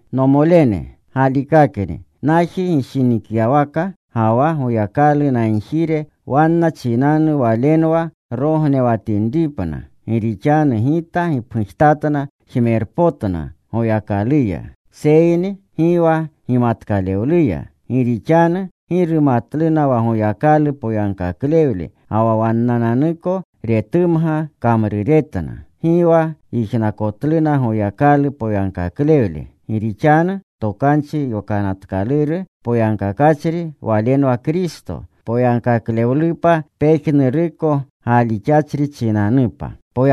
Nomolene, galikakni, naji gishinikyawaka, ga wa Goyakalu nagjire wanna chinanu walenwa rognewatinripna. Gi rixanu gita gipgujtatna jmerpotna Goyakaluya, seyni gi wa gimatkalewluya. Gi rixanu gi rumatluna wa Goyakalu poyagkaklewle ga wa wannanuko retumga kamruretna. Gi wa yijnakotluna Goyakalu poyagkaklewle. Gi rixanu Tokanchi Yokanatkaluru poyagkakachri walenwa Kristo, poyagkaklewlupa pejnuruko galixachri chinanupa.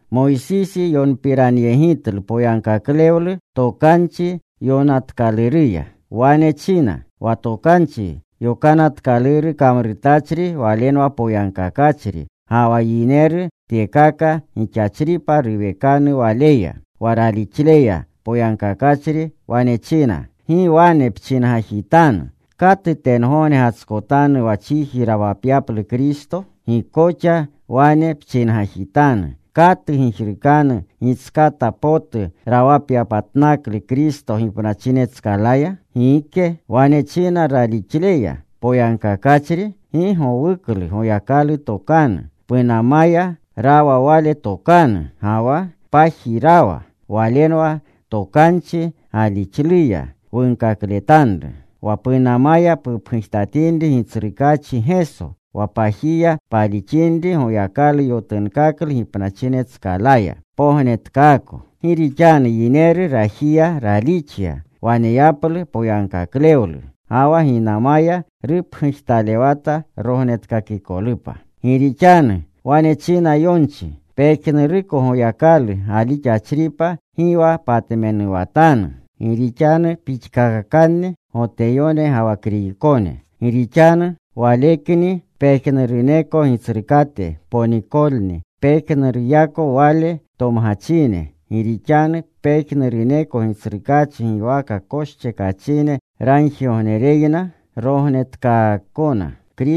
Moysisi yonpiranyegitlu poyagkaklewlu Tokanchi Yokanatkaluruya. Wane china: wa Tokanchi Yokanatkaluru kamrutachri walenwa poyagkakachri, ga wa yineru tyekaka gixachripa ruwekanu waleya. Wa ralixleya poyagkakachri wane china: “Gi wane pchingajitanu, ‘¿Katu tengogne gatskotanu wa chiji rawapyaplu Kristo?’” Gi koxa wane pchingajitanu: “¿Katu gijrukanu gitskata potu rawapyapatnaklu Kristo gipnachinetskalaya?” Gike. Wane china ralixleya poyagkakachri, “Gi gowuklu Goyakalu tokanu. Punamaya rawa Wale tokanu, ga wa paji rawa.” Walenwa tokanchi galixluya, wunkakletanru. Wa punamaya pupgujtatinri Gitsrukaachi Geso, wa pajiya palixinri Goyakalu yotunkaklu gipnachinetskalaya, pognetkaako. Gi rixanu yineru rajiya ralixya waneyaplu poyagkaklewlu. Ga wa ginamaya rupgujtalewata rognetkakikolupa. Gi rixanu wane china yonchi: “Pejnuruko Goyakalu galixachripa gi wa patmenuwatanu.” Gi rixanu pixkakakanni Goteyone ga wa Kriykone. Gi rixanu Walekni pejnuruneko Gitsrukate ponikolni pejnuruneyako Wale tomgachine. Gi rixanu pejnuruneko Gitsrukaachi giwaka koschekachine ragjirgognereyna rognetkaakona.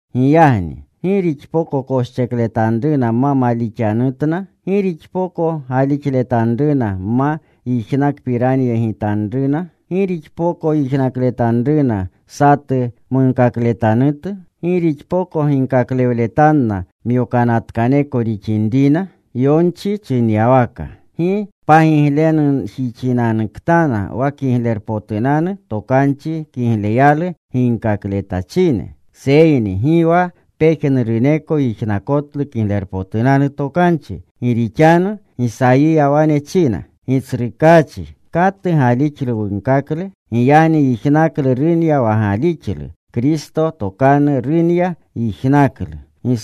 Giyagni ¿gi rixpoko koschekletanruna ma malixanatanutna? ¿Gi rixpoko galixletanruna ma yijnakpiranyegitanruna? ¿Gi rixpoko yijnakletanruna satu munkakletanutu? ¿Gi rixpoko ginkaklewletanna myokanatkoneko rixinna? Yonchi chinyawaka, “¡Gi pagiglenjixinanuktana wa Kiglerpotunanu Tokanchi kigleruya ginkakletachine!” Seyni gi wa pejnuruneko yijnakotlu Kiglerpotunanu Tokanchi. Gi rixanu Gisayiya wane china, “Gitsrukaachi, ¿katu galixlu wunkakle?” Giyagni yijnaklu runya wa galixlu. Kristo tokanu runya yijnaklu.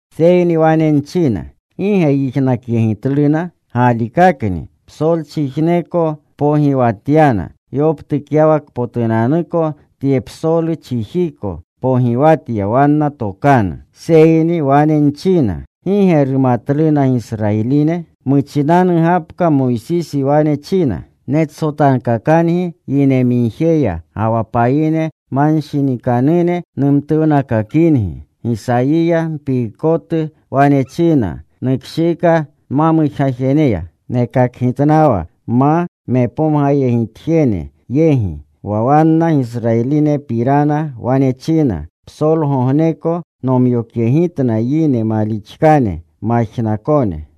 Seyni wane nchina, ¿Gi ge yijnakyegitluna? Galikakni. Psolchijneko pogiwatyana. Yoptukyawakpotunanuko tye psolu chijiko Pogiwatya wanna tokanu. Seyni wane nchina, ¿Gi ge rumatluna Gisrayiline? Muchinanu gapka Moysisi wane china: Netsotankakangi yine migjeya, ga wa payine manshinikanune numtuwnakakingi. Gisayiya mpiikotu wane china: Nukshiika nma mujgajeneya. Nekakgitnawa nma mepomgayegitjene yegi. Wa wanna Gisrayilinepirana wane china: Psolgogneko nomyokyegitna yine malixkane, majnakone.